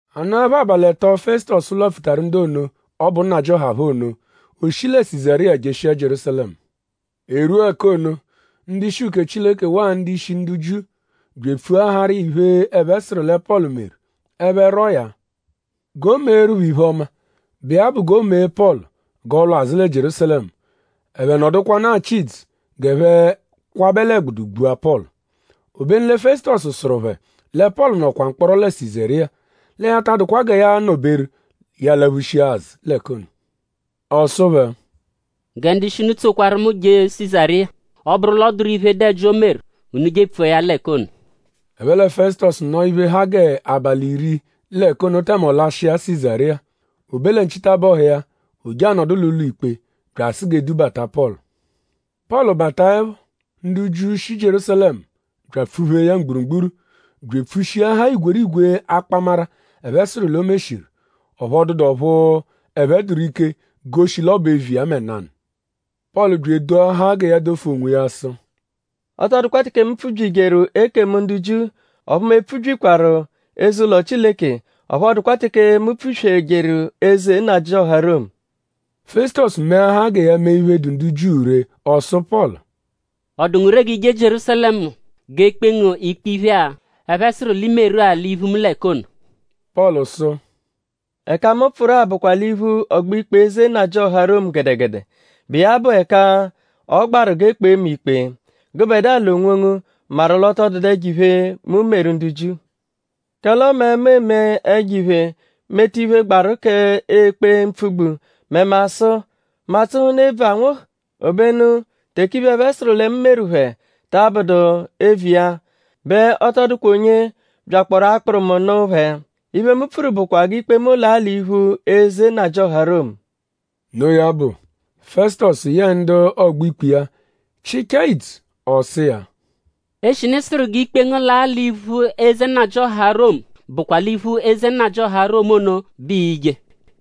A nọepho abalị ẹto, Fẹsutosu lwapfutaru ndu ono, ọ bụ nnajịoha phẹ ono; o shi lẹ Sizariya jeshia Jierúsalẹmu. E rwua ẹka ono; ndu-ishi uke Chileke waa ndu-ishi ndu Jiu bya epfuaharụ iya iphe, ẹphe sụru lẹ Pọlu meru. Ẹphe rwọo ya g'o meeru phẹ iphe-ọma, bụ iya bụ g'o mee Pọlu g'ọ lwa azụ lẹ Jierúsalẹmu. Ẹphe nọdukwanu achị idzu g'ẹphe kwabẹ l'ẹgbudu gbua Pọlu. Obenu lẹ Fẹsutosu sụru phẹ lẹ Pọlu nọkwa mkpọro lẹ Sizariya. Lẹ ya ta adụkwa gẹ ya anọ-beru ya alaphushia azụ l'ẹka ono. Ọ sụ phẹ: “Gẹ ndu-ishi unu tsokwaru mu je Sizariya. Ọ -bụru l'ọ dụru iphe, dụ ẹji, o meru; unu je epfua ya l'ẹka ono.” Ẹphe lẹ Fẹsutosu nọo iphe, ha g'abalị iri l'ẹka ono tẹme ọ lashịa Sizariya. O be lẹ nchitabọhu iya; o je anọdu l'ụlo-ikpe bya asụ g'e dubata Pọlu. Pọlu bataẹpho; ndu Jiu, shi Jierúsalẹmu bya apfụ-phee ya mgburugburu bya epfushiahaa igwerigwe akpamara, ẹphe sụru l'o meshiru. Ọphu ọ dụdu ọphu ẹphe dụru ike goshi l'ọ bụ eviya mẹ nanụ. Pọlu bya edoahaa gẹ ya dofu onwiya sụ: “Ọ tọ dụkwa teke mu pfubyijeru ekemu ndu Jiu; ọphu mu epfubyikwaru eze-ụlo Chileke; ọphu ọ dụkwa teke mu pfuswejeru eze nnajịoha Romu.” Fẹsutosu meahaa gẹ ya mee iphe, dụ ndu Jiu ree; ọ sụ Pọlu: “?Ọ dụ ngu ree g'i je Jierúsalẹmu g'e kpee ngu ikpe iphe-a, ẹphe sụru l'i meru-a l'iphu mu l'ẹka ono?” Pọlu sụ: “Ẹka-a, mu pfụru-a bụkwa l'iphu ọgbo-ikpe eze nnajịoha Romu gẹdegede, bụ iya bụ ẹka ọ gbaru g'e kpee mu ikpe. Gụbedua l'onwongu maru l'ọ tọ dụdu ẹjo-iphe, mu meru ndu Jiu. Kẹle ọme mu eme ẹjo-iphe; meta iphe, gbaru k'ekpe mpfugbu mẹ mu asụ?Mu atsụhunu ebvu anwụhu? Obenu teke iphe, ẹphe sụru lẹ mu meru phẹ ta abụdu eviya bẹ ọ tọ dụkwa onye byakpọoru akpụru mu nụ phẹ. Iphe, mu pfuru bụkwa g'ikpe mu laa l'iphu eze nnajịoha Romu.” Noo ya bụ; Fẹsutosu yẹe ndu ọgbo-ikpe iya chịchaa idzu; ọ sụ iya: “Eshinu ị sụru g'ikpe ngu laa l'iphu eze nnajịoha Romu bụkwa l'iphu eze nnajịoha Romu ono bẹ ii-je.”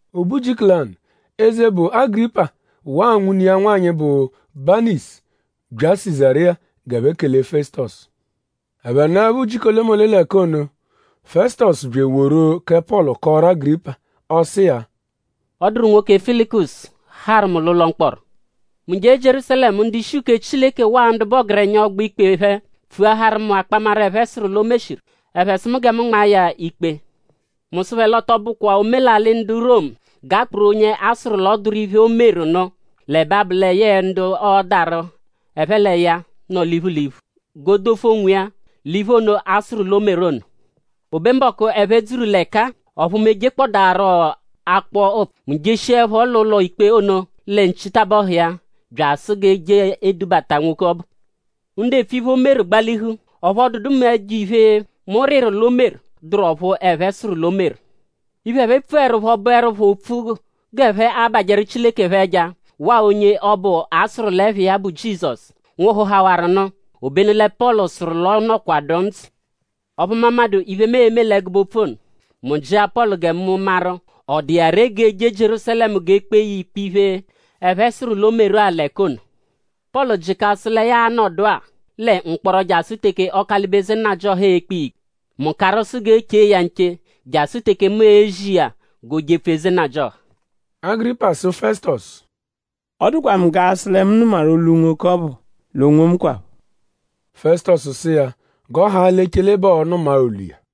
O be ujiku lanụ; eze, bụ Agịripa waa nwune iya nwanyị, bụ Baniisu bya Sizariya g'ẹphe kele Fẹsutosu. Ẹphe nọepho ujiku olemole l'ẹka ono; Fẹsutosu bya eworu kẹ Pọlu kọoru Agịripa. Ọ sụ iya: “Ọ dụru nwoke, Felikusu harụ mu l'ụlo mkpọro. Mu jee Jierúsalẹmu; ndu-ishi uke Chileke waa ndu bụ ọgerenya ọgbo-ikpe phẹ pfuaharu mu akpamara, ẹphe sụru l'o meshiru. Ẹphe sụ mu gẹ mu nmaa ya ikpe. Mu sụ phẹ l'ọ tọ bụkwa omelalị ndu Romu g'a kpụru onye a sụru l'ọ dụru iphe, o meru nụ; l'ẹbe abụ lẹ yẹe ndu ọodaru ẹphe l'iya nọ l'iphu l'iphu g'o dofu onwiya l'iphe ono, a sụru l'o meru ono. “O be mbọku, ẹphe dzuru l'ẹka-a; ọphu mu ejekpọdaaro akpọ ụpfu. Mu jeshiẹpho l'ụlo-ikpe ono lẹ nchitabọhu iya bya asụ g'e je edubata nwoke ọbu. Ndu epfu iphe, o meru gbalihu; ọphu ọ dụdu mẹ ẹjo-iphe, mu rịru l'o meru, dụru ọphu ẹphe sụru l'o meru. Iphe, ẹphe pfuẹrupho bụerupho opfu g'ẹphe abajẹru Chileke phẹ ẹja waa onye ọbu, a sụru l'ẹpha iya bụ Jizọsu, nwụhuhawaru nụ; obenu lẹ Pọlu sụru l'ọ nọkwadu ndzụ. Ọphu mu amadụ iphe, mu e-me l'ẹgube opfu ono. Mu jịa Pọlu gẹ mu maru?ọ dụ iya ree g'o jee Jierúsalẹmu g'e kpee ya ikpe iphe, ẹphe sụru l'o meru-a l'ẹka ono. Pọlu jịka sụ lẹ ya a-nọdua lẹ mkpọro jasụ teke Ọkalibe eze nnajịoha e-kpe iya ikpe. Mu karụ sụ g'e che iya nche jasụ teke mu e-zi iya g'o jepfu eze nnajịoha.” Agịripa sụ Fẹsutosu: “Ọ dụkwa mu g'a sụ lẹ mu nụmaru olu nwoke ọbu l'onwomu kwaphọ.” Fẹsutosu sụ iya g'ọ haa l'echele bẹ ọo-nụma-a olu iya.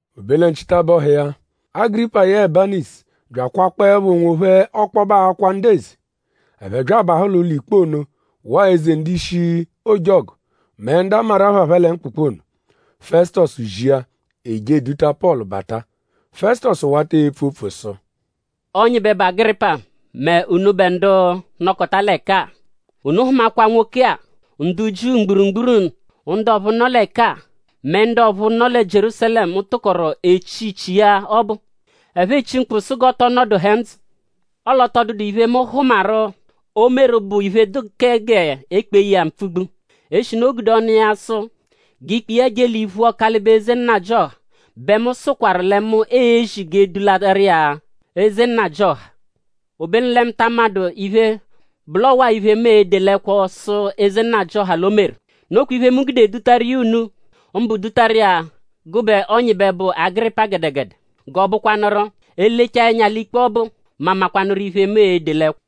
O be lẹ nchitabọhu iya; Agịripa yẹe Baniisu bya akwakpọepho onwophẹ ọkpobe akwa ndu eze. Ẹphe bya abahụ l'ụlo-ikpe ono waa eze ndu-ishi ojọgu; mẹ ndu a maru ẹpha phẹ lẹ mkpụkpu ono. Fẹsutosu zia; e je eduta Pọlu bata. Fẹsutosu wata epfu opfu sụ: “Ọnyibe, bụ Agịripa mẹ unubẹ ndu nọkota l'ẹka-a. Unu hụmakwa nwoke-a, ndu Jiu mgburugburu ndu ọphu nọ l'ẹka-a mẹ ndu ọphu nọ lẹ Jierúsalẹmu tụkoru echi ichi iya ọbu. Ẹphe echi mkpu sụ g'ọ tọ nọduhe ndzụ. Ọle ọ tọ dụdu iphe, mu hụmaru, o meru bụ iphe, dụ k'e gude kpee ya mpfugbu. Eshinu o gude ọnu iya sụ g'ikpe iya je l'iphu Ọkalibe eze nnajịoha bẹ mu sụkwaru lẹ mu e-zi g'e dularu iya eze nnajịoha. Obenu lẹ mu ta amadụ iphe, bụ l'ọwa-a iphe, mu e-de l'ẹkwo sụ eze nnajịoha l'o meru. Nokwa iphe, mu gude dutaru iya unu; mbụ dutaru iya gụbe Ọnyibe, bụ Agịripa gẹdegede g'ọobukwanuru: e -lechaa ẹnya l'ikpe ọbu; mu amakwanụru iphe, mu e-de l'ẹkwo.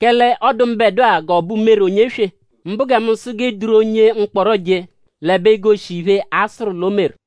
Kẹle ọ dụ mbẹdua g'ọ bụ umere onye-eswe mbụ gẹ mu sụ g'e duru onye mkpọro je; l'ẹbe egoshi iphe, a sụru l'o meru.”